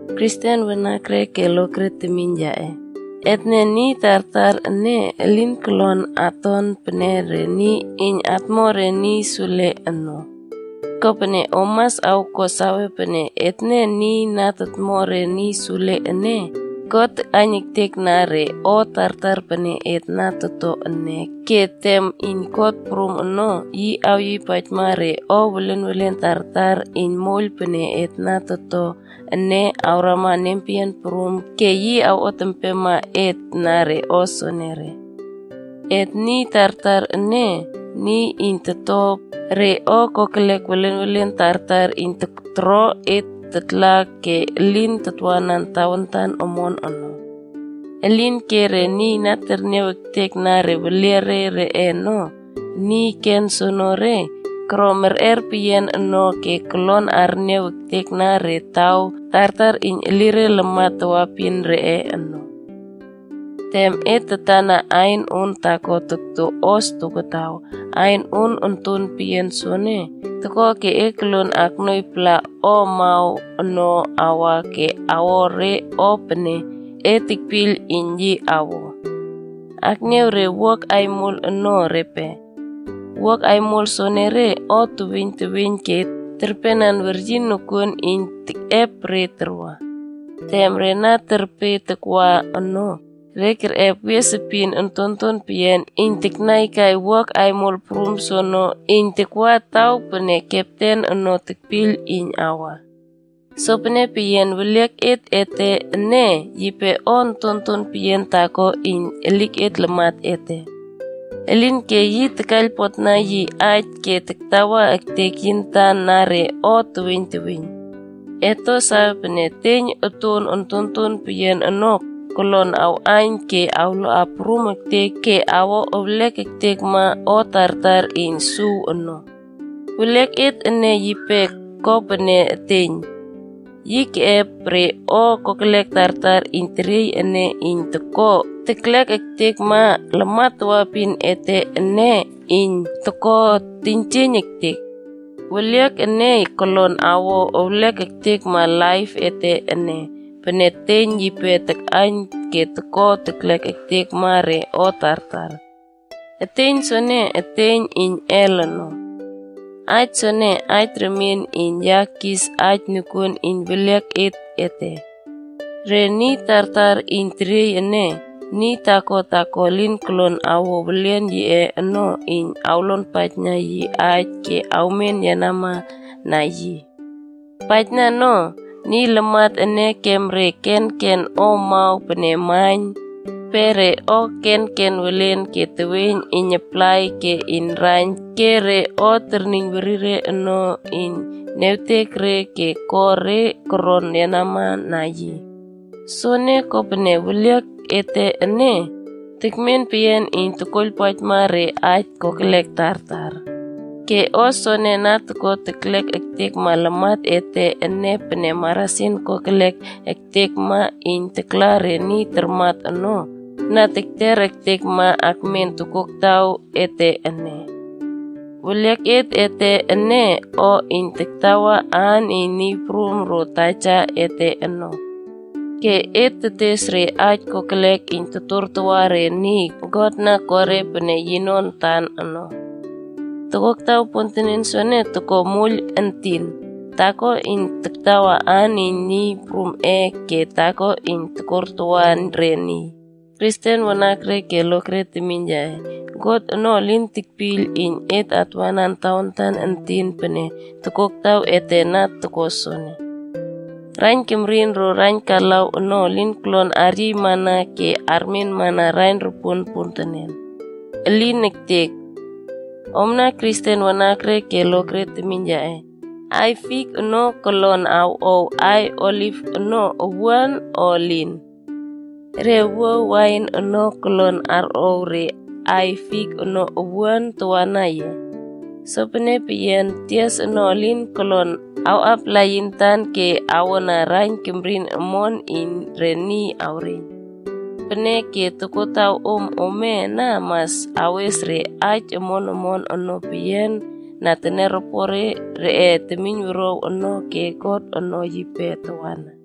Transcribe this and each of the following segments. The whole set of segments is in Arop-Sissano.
Kristen wanakre ke lokre temiyn yaꞌe, etne niy tartar ene elin kolon aton pene niy iyn atmo re niy sule ono. Kopene om mas awko sawe pene etne niy na totmo re niy sule ene, God takꞌaiyn ektekna re o tartar pene et na toto ene ke tem iyn kot prum ono, yi awyiypaijma re o welenwelen tartar iyn moiyl pene et na to ene awrama nempeyian prum ke yi awot empema et na re o soonore. Et niy tartar ene, niy iyn toto re o kokelek welenwelen tartar iyn toro et tatla ke elin tatwanan tawantan omon ono. Elinke, re niy na terniaw ektekna weliare reꞌe ono, niy ken soenere ene, koro merꞌer peyian no ke kolon arniaw ektekna re taw tartar iyn elire lamat tawaepin reꞌe ono. Tem et tatana ain on taako tokto hos tokotaw, ain on ontonton peyian soene toko ke e kuo sawe pene e koluon aknuoiypala o amaw ono awa ke awo re o pene e tekpiyl iyn yi awo. Akniaw re wuak aimol ono repe. Wuak aimol soenere o teweiyn teweiyn ke terpenan weryin nokuon iyn tekꞌep re tarwa. Tem re na terpe takwa ono, re kerꞌep wies epin ontonton peyian iyn taknaikai wuak aimol prum soono iyn takwa taw pene kepten ono tekpiyl iyn awa. Sopene peyian, weliaket ete ene yipe o ontonton peyian taako iyn elik lamat ete. Elinke yi takaiylpotna yi aij ke taktawa ektek yi antan na re o teweiyn teweiyn. Et to sawe pene, eteiyn oton ontonton peyian ono kolon awꞌaiyn ke awloa prum ektek ke awo ewlek ektekma o tartar iyn suw ono. Weliaket ene yipe ko pene eteiyn. Yi keꞌep re o kokelek tartar iyn teriey ene iyn toko teklek ektekma lamat tawaepin ete ene iyn toko teiynjieiyn ektek. Weliak ene kolon awo ewlek ektekma laip ete ene pene eteiyn yipe takꞌaiyn ke toko teklek ektekma re o tartar. Eteiyn soene, eteiyn iyn Hel ono. Aij soene aij remien iyn ya kis aij nokuon iyn welieket ete. Re niy tartar iyn teriey ene, niy taako taako elin kolon awo welian yiꞌe ono iyn awlonpaijna yi aij ke awmen yenama na yi. Paijna no, niy lamat ene kem re kenken o amaw pene maiyn, pe re o kenken welen ke teweiyn iyn aplai ke iyn raiyn ke tias ke re o terniyn werire ono iyn niawtek re ke ko re koron yenama na yi. Soene, kopene weliaket ete ene, tekmen peyian iyn tokoiylpaijma re aij kokelek tartar. Ke o soene na toko teklek ektekma lamat ete ene pene marasin kokelek ektekma iyn takla re niy tarmat ono, na keter ektekma akmen tokoktaw ete ene. Weliaket ete ene o iyn tatawa aan iyn Niy Prum ro Taja ete ono. Ke et tetes re aij kokelek iyn totortawa re niy God na ko re koro pene yino antan ono. Tokoktaw pontenen soene toko moiyl entin, taako iyn taktawa aan iyn Niy Prumꞌe ke taako iyn tokortawa re niy. Kristen wanakre ke lokre temiyn yaꞌe, God ono elin tekpiyl iyn et atwanan tawantan entin pene tokoktaw ete na toko soene. Raiyn kemrin ro raiyn kalaw ono elin kolon aryiy awrama ke armenmana raiyn ropuon pontenen. Elin ektek. Omna Kristen wanakre ke lokre temiyn yaꞌe, aiy fik ono kolon awꞌow aiy oliv ono owuan, o elin? Re wuaw wain ono kolon arꞌow re aiy fik ono owuan tawana ye? Sopene peyian, tias ono elin kolon awꞌapala yi antan ke awona raiyn kemrin omon iyn re niy awreiyn. Peneke, tokotawom ome ana mas awes re aij omon omon ono peyian na teniaropore reꞌe temiynwuruaw ono ke God ono yipe tawana.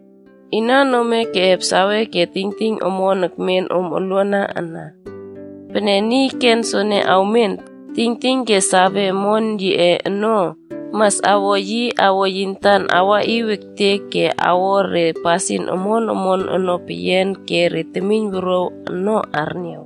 Inan ome keꞌep sawe ke tingting omon ekmen om oluana ana? Pene niy ken soene ekmen, tingting ke sawe omon yiꞌe ono, mas awo yi awo yi antan awaꞌiw ektek ke awo re pasin omon omon ono peyian ke re temiynwuruaw ono arniaw.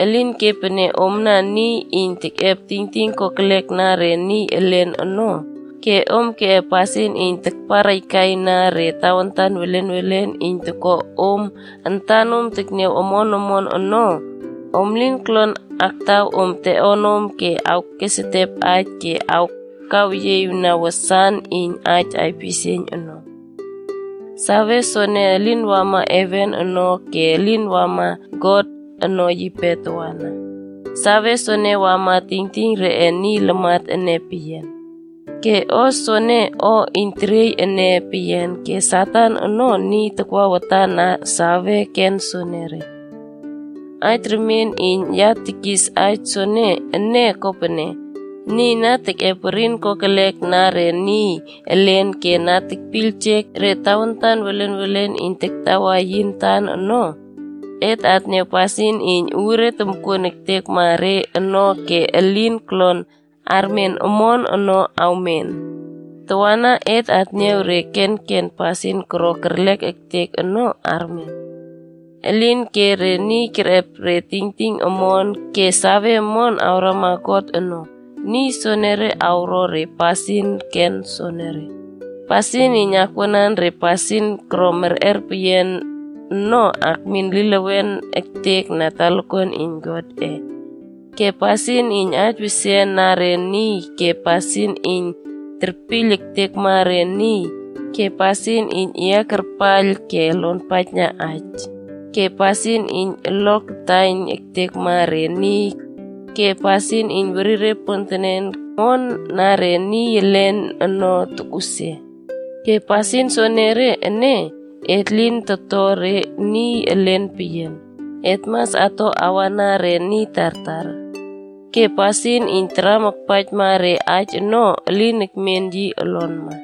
Elinke pene omna niy iyn tekꞌep tingting kokelek na re niy elen ono, ke om keꞌep pasin iyn tarparꞌaikaina re tawantan welenwelen iyn toko om antanom tekniaw omon omon ono, om lin kolon aktaw om teꞌonom ke awkesetep aij ke awkaweyieꞌiwna wasan iyn aij aipisieiyn ono. Sawe soene elin wama heven ono ke elin wama God ono yipe tawana. Sawe soene wamana tingting reꞌe niy lamat ene peyian. Ke o soene, o iyn teriey ene peyian ke Satan ono niy takwa watana sawe ken soenere. Aij remien iyn ya tekis aij soene ene kopene, niy na tekꞌep werin kokelek na re niy elen ke na tekpiyljek re tawantan welenwelen iyn taktawa yi antan ono, et atniaw pasin iyn uure tomkuon ektekma re ono ke elin kolon armen omon ono awmen. Tawana, et atniaw re kenken pasin koro kerlek ektek ono armen. Elinke re niy kerꞌep re tingting omon ke save omon karama God ono, niy soenere awro re pasin ken soenere: pasin iyn akwuanan re pasin koro merꞌer peyian ono akmin elilewen ektek na talakuan iyn Godꞌe, ke pasin iyn aij wesian na re niy ke pasin iyn terpiyl ektekma re niy ke pasin iyn yeꞌiakarpaiyl ke luonpaijna aij, ke pasin iyn olo taiyn ektekma re niy ke pasin iyn werire pontenen iyn kuo pasin omon na re niy elen ono tokꞌusia. Ke pasin soenere ene, et lin ato re niy elen peyian, et mas ato awana re niy tartar. Ke pasin iyn taram akpaijma re aij ono elin ekmen yi olonma.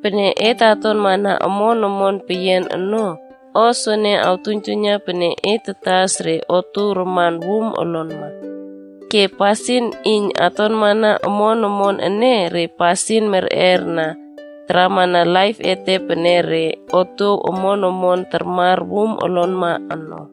Pene et atonmana omon omon peyian ono, o soene toktuiynjuiyna pene et tatas re otuow raman wum olonma. Ke pasin iyn atonmana omon omon ene, re pasin merꞌer ono taramana laip ete pene re otuow omon omon tarmar wum olonma ono.